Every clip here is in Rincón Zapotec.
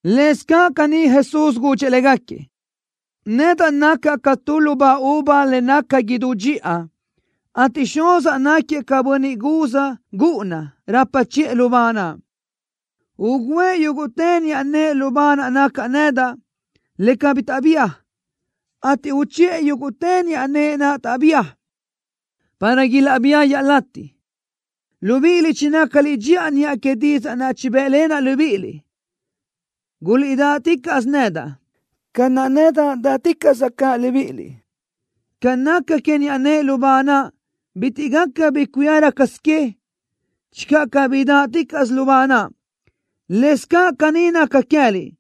Lëscaʼ caní Jesús gudxëʼ légaquiëʼ: —Nacaʼ nedaʼ ca tu lubá uva le naca idú dxiʼa, ateʼ Xuzaʼ náquiëʼ ca bönniʼ guz gúʼuna rapa chiʼë lubá naʼ. Ugǘëʼ yúguʼtë niʼa nëʼe lubá naʼ nacaʼ nedaʼ, le cabí bi taʼbía, ateʼ uchiʼë yúguʼtë niʼa nëʼe naʼ taʼbía, para ilaʼbía iaʼlatiʼ. Libíʼiliʼ chinácaliʼ dxiʼa niʼa que didzaʼ naʼ chibë́ʼlenaʼ libíʼiliʼ. Guliʼdáʼticaʼsö nedaʼ, ca naʼ nedaʼ dáʼticaʼsaʼ caʼ libíʼiliʼ. Ca naca que niʼa nëʼe lubá naʼ, bitiʼ gaca bi cuía rácasö que, channö cabí dáʼticaʼsö lubá naʼ, lëscaʼ caní naca queë́liʼ,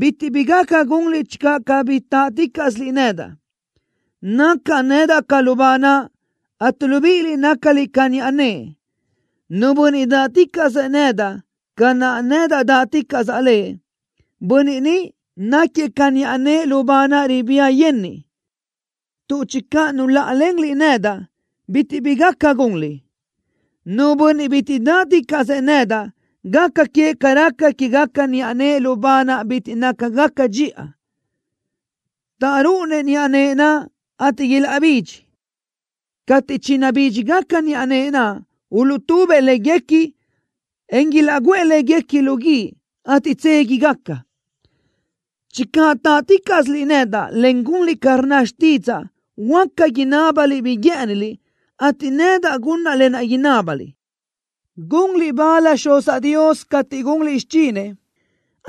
bitiʼ bi gaca gunliʼ channö cabí táʼticaʼsiliʼ nedaʼ. ’Nacaʼ nedaʼ ca lubá naʼ, ateʼ libíʼiliʼ nácaliʼ ca niʼa nëʼe. Nu bönniʼ dáʼticaʼsëʼ nedaʼ, ca naʼ nedaʼ dáʼticaʼsaʼ lëʼ, bönniʼ ni náquiëʼ ca niʼa nëʼe lubá naʼ ribía yenniʼ, tuʼ channö nuláʼalenliʼ nedaʼ, bitiʼ bi gaca gunliʼ. Nu bönniʼ bitiʼ dáʼticaʼsëʼ nedaʼ, gaca queëʼ ca raca quégaca niʼa nëʼe lubá naʼ bitiʼ nácagaca dxiʼa, taʼrúʼunëʼ niʼa nëʼe naʼ, ateʼ ilaʼbidxi. Cateʼ chinabídxigaca niʼa nëʼe naʼ, uluʼtubëʼ léguequi, en ilaʼguʼë léguequi lu guíʼ, ateʼ tséguigaca. ’Channö táʼticaʼsiliʼ nedaʼ, en gunliʼ ca rnna xtídzaʼa, huáca inábaliʼ bi guë́ʼëniliʼ, ateʼ nedaʼ gunaʼ lë naʼ inábaliʼ. Gunliʼ bal Xuzaʼ Dios cateʼ gunliʼ xichinëʼ,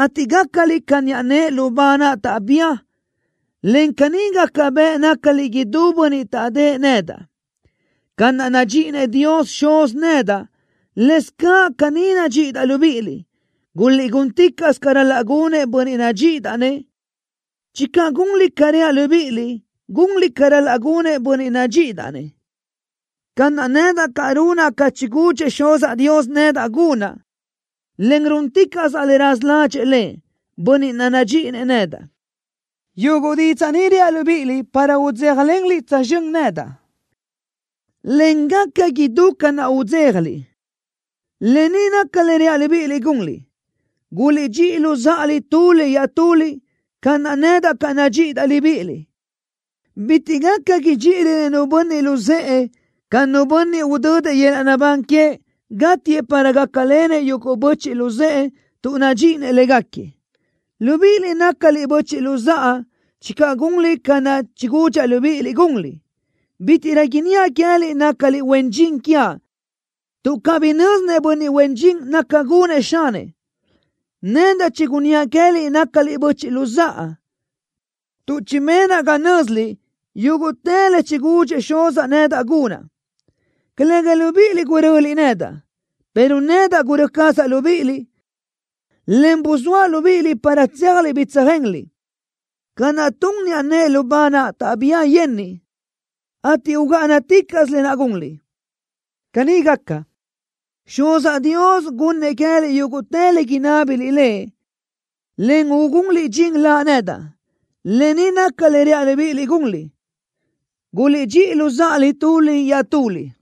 ateʼ gácaliʼ ca niʼa nëʼe lubá naʼ taʼbía, en caní gaca bëʼ nácaliʼ idú bönniʼ taʼdë́ʼë nedaʼ. Ca naʼ nadxíʼinëʼ Dios Xuz nedaʼ, lëscaʼ caní nadxíʼidaʼ libíʼiliʼ. Guliʼgúnticaʼsö ca ral-laʼ gunëʼ bönniʼ nadxíʼidaʼ-nëʼ. Channö gunliʼ ca reaʼ libíʼiliʼ, gunliʼ ca ral-laʼ gunëʼ bönniʼ nadxíʼidaʼ-nëʼ, ca naʼ nedaʼ caʼ runaʼ ca chigudxëʼ Xuzaʼ Dios nedaʼ gunaʼ, en rúnticaʼsaʼ le raza ládxëʼë Lëʼ, Bönniʼ naʼ nadxíʼinëʼ nedaʼ. ’Yuguʼ didzaʼ ni reaʼ libíʼiliʼ para udzéjalenliʼ tsözxö́n nedaʼ, en gaca idú ca naʼ udzéjaliʼ. Lë ni naca le reaʼ libíʼiliʼ gunliʼ: Guliʼdxíʼi luzáʼaliʼ tuliʼ iaʼtuliʼ, ca naʼ nedaʼ caʼ nadxíʼidaʼ libíʼiliʼ. Bitiʼ gaca idxíʼirönëʼ nu bönniʼ luzë́ʼë ca nu bönniʼ udödëʼ yöl-laʼ naʼbán queëʼ, gátiëʼ para gácalenëʼ yuguʼ böchiʼ luzë́ʼë tuʼ nadxíʼinëʼ légaquiëʼ. Libíʼiliʼ nácaliʼ böchiʼ luzáʼa channö gunliʼ ca naʼ chigudxaʼ libíʼiliʼ gunliʼ. Bítiʼrö inníaʼ queë́liʼ nácaliʼ huen dxin quiaʼ, tuʼ cabí nö́zinëʼ bönniʼ huen dxin naca gunëʼ xanëʼ. Nedaʼ chigunníaʼ queë́liʼ nácaliʼ böchiʼ luzáʼa, tuʼ chibenaʼ ga nö́ziliʼ yúguʼtë le chigudxëʼ Xuzaʼ nedaʼ gunaʼ. Calëga libíʼiliʼ guröliʼ nedaʼ, pero nedaʼ gurö́ cazaʼ libíʼiliʼ, en buzóaʼ libíʼiliʼ para tséajliʼ bi tsöjenliʼ, ca naʼ tun niʼa nëʼe lubá naʼ taʼbía yenniʼ, ateʼ ugáʼanaticaʼsö lë naʼ gunliʼ. Caní gaca, Xuzaʼ Dios gunnëʼ queë́liʼ yúguʼtë le inábiliʼ Lëʼ, en ugunliʼ dxin Laʼ nedaʼ. Lë ni naca le reaʼ libíʼiliʼ gunliʼ: Guliʼdxíʼi luzáʼaliʼ tuliʼ iaʼtuliʼ.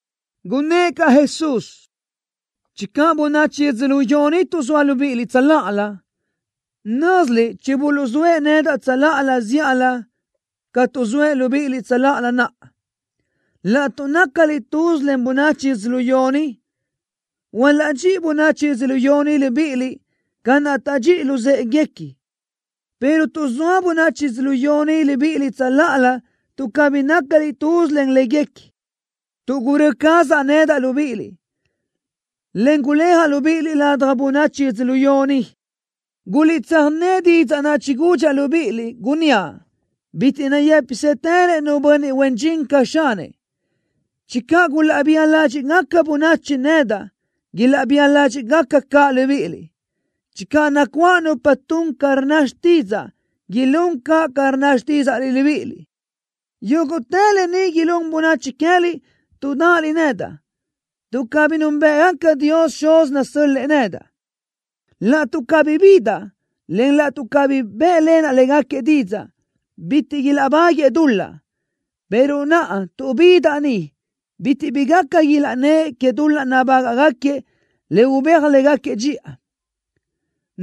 Gunnë́ʼ caʼ Jesús: —Channö bönachi yödzölió ni tuʼzóa libíʼiliʼ tsöláʼalö, nö́ziliʼ chibuluʼzóëʼ nedaʼ tsöláʼalö zíʼalö ca tuʼzóëʼ libíʼiliʼ tsöláʼalö naʼa. Laʼtuʼ nácaliʼ tuz len bönachi yödzölió ni, hualaʼdxíʼi bönachi yödzölió ni libíʼiliʼ ca naʼ taʼdxíʼi luzë́ʼeguequi, pero tuʼzóa bönachi yödzölió ni libíʼiliʼ tsöláʼalö tuʼ cabí nácaliʼ tuz len léguequi, tuʼ gurö́ cazaʼ nedaʼ libíʼiliʼ, en guléajaʼ libíʼiliʼ ladaj bönachi yödzölió ni. Guliʼtsöjné didzaʼ naʼ chigudxaʼ libíʼiliʼ, gunníaʼ: Bitiʼ nayë́pisëtërëʼ nu bönniʼ huen dxin ca xanëʼ. Channö gulaʼbía ládxiʼgaca bönachi nedaʼ, ilaʼbía ládxiʼgaca caʼ libíʼiliʼ. Channö nacuáʼ nupa tun ca rnna xtídzaʼa, ilún caʼ ca rnna xtídzaʼliʼ libíʼiliʼ. Yúguʼtë lë ni ilún bönachi queë́liʼ tuʼ dáʼaliʼ nedaʼ, tuʼ cabí núnbëʼgaca Dios Xuz nasö́l-lëʼë nedaʼ. ’Laʼtuʼ cabí bidaʼ, en laʼtuʼ cabí bë́ʼlenaʼ légaquiëʼ didzaʼ, bitiʼ ilaʼbáguëʼë dul-laʼ, pero naʼa tuʼ bidaʼ ni, bitiʼ bi gaca ilaʼnnë́ʼ que dul-laʼ nabágaʼgaquiëʼ le ubéaj légaquiëʼ dxiʼa.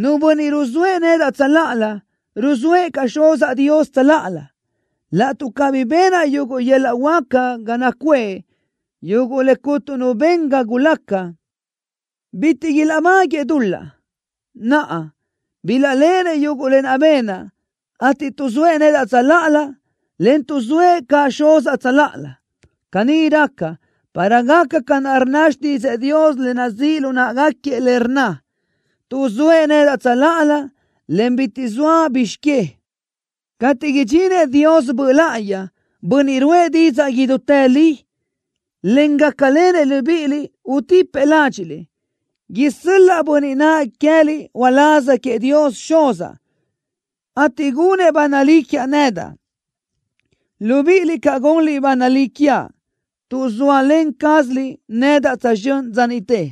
Nu bönniʼ ruzóëʼ nedaʼ tsöláʼalö, ruzóëʼ caʼ Xuzaʼ Dios tsöláʼalö. Laʼtuʼ cabí benaʼ yuguʼ yöl-laʼ huáca ga nacuʼë, yuguʼ le cuntu nu ben ca gulaca, bitiʼ ilaʼbáguëʼë dul-laʼ. Naʼa, bilaʼléʼenëʼ yuguʼ lë naʼ benaʼ, ateʼ tuʼzóëʼ nedaʼ tsöláʼalö, en tuʼzóëʼ caʼ Xuzaʼ tsöláʼalö. Caní raca, para gaca ca rnna xtídzëʼë Dios, le nazíʼ lu náʼagaquiëʼ, le rnna: Tuʼzóëʼ nedaʼ tsöláʼalö, en bitiʼ zoa bizx que. ’Cateʼ idxinëʼ Dios Böʼ Láʼayi, Bönniʼ ruʼë didzaʼ idútë li, en gácalenëʼ libíʼiliʼ, utipëʼ ládxiʼliʼ. Isö́l-laʼa Bönniʼ naʼ queë́liʼ uláz queëʼ Dios Xuz, ateʼ gunëʼ ba nalí quiaʼ nedaʼ. Libíʼiliʼ caʼ gunliʼ ba nalí quiaʼ, tuʼ zóalen cázaliʼ nedaʼ tsözxö́n dza niʼte.